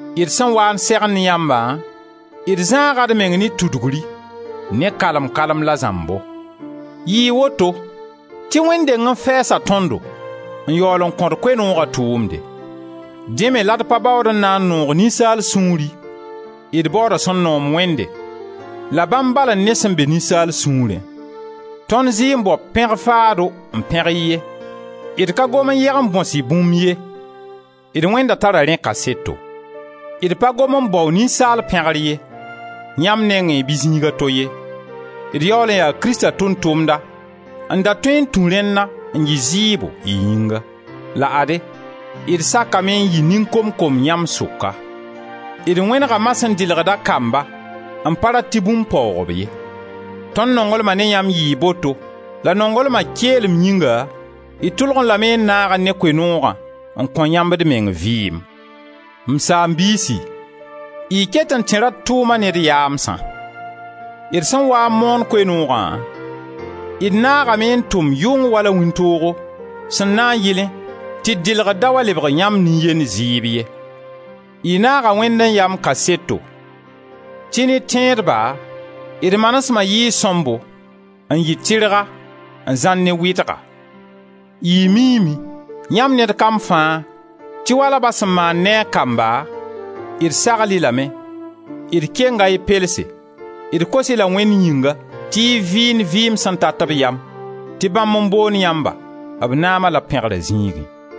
D sẽn waa n segend yãmbã, d zãaga d meng ne tudugri, ne kalem-kalem la zãmbo. Yɩɩ woto tɩ Wẽnd deng n fɛɛsa tõndo, n yaool n kõ-d Koe-nooga tʋʋmde. Dẽ me la d pa baood n na n noog ninsaal sũuri, d baooda sẽn noom Wẽnde, la bãmb bal n ne sẽn be ninsaal sũurẽ. Tõnd zɩ n bao pẽg-faado n pẽg-y ye, d ka gom n yeg n bõs-y bũmb ye. D Wẽnda tara rẽ kaseto. D pa gom n bao ninsaal pẽgr ye, yãmb nengẽ bɩ zĩig a to ye. D yaool yaa Krista tʋʋm-tʋmda n da tõe n tũ rẽnna n yɩ zɩɩbo y yĩnga. La ade, d sakame n yɩ nin-kom-kom yãmb sʋka. D wẽnega ma sẽn dɩlgd a kamba n pa rat tɩ bũmb paoog-b ye. Tõnd nonglma ne yãmb yɩɩ boto la nonglma keelem yĩnga d tʋlgẽ lame n naagẽ ne Koe-noogã n kõ yãmb d meng vɩɩm. M saam-biisi, y ket n tẽra d tʋʋma ne d yaamsã. D sẽn waa n moon Koe-noogã, d naagame n tʋm yʋng wala wĩntoogo sẽn na n yɩlẽ tɩ d dɩlgr da wa lebg yãmb nin-yend zɩɩb ye. Y naaga Wẽnd n ya m kaseto tɩ ne tẽedba d manesema yɩɩ sõmbo n yɩ tɩrga, n zãr ne wɩdga. Y miime, yãmb ned kam fãa, tɩ wala ba sẽn maand ne a kamba d sagl-y lame, d kenga y pelse, d kos-y la Wẽnd yĩnga tɩ y vɩɩnd vɩɩm sẽn tat b yam, tɩ bãmb n boond yãmba b naama la b pẽgra zĩigẽ.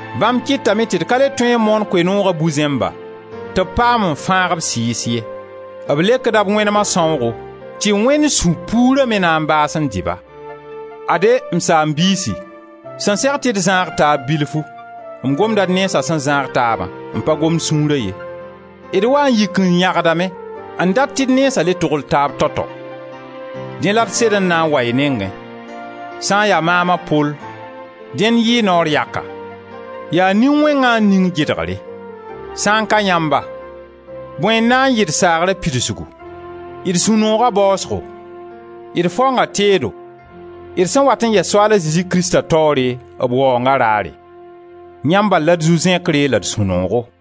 Bãmb kɩtame tɩ d ka le tõe n moon Koe-noogã bu-zẽmba tɩ b paam n fãag b sɩɩs ye. B lekda b wẽnema sãoogo tɩ Wẽnd sũ-puura me na n baas n dɩ-ba. Ade, m saam-biisi, sẽn seg tɩ d zãag taab bilfu — m gomda d nensa sẽn zãag taabã, m pa gomd sũura ye — d waa n yik n yãgdame n dat tɩ d nensa le togl taaba tao-tao. Dẽ la d sed n na n wa y nengẽ. Sã n ya maam a Pol, dẽn yɩɩ naoor yaka. Yaa Nin-wẽngã n ning gɩdgre. Sã n ka yãmba, bõe n na n yɩ d saagra pidsgu, d sũ-nooga baasgo, d faonga teedo, d sẽn wat n yɛs Soaal a Zezi Krista taoore b Waoonga raare? Yãmb bal la d zu-zẽkre la d sũ-noogo!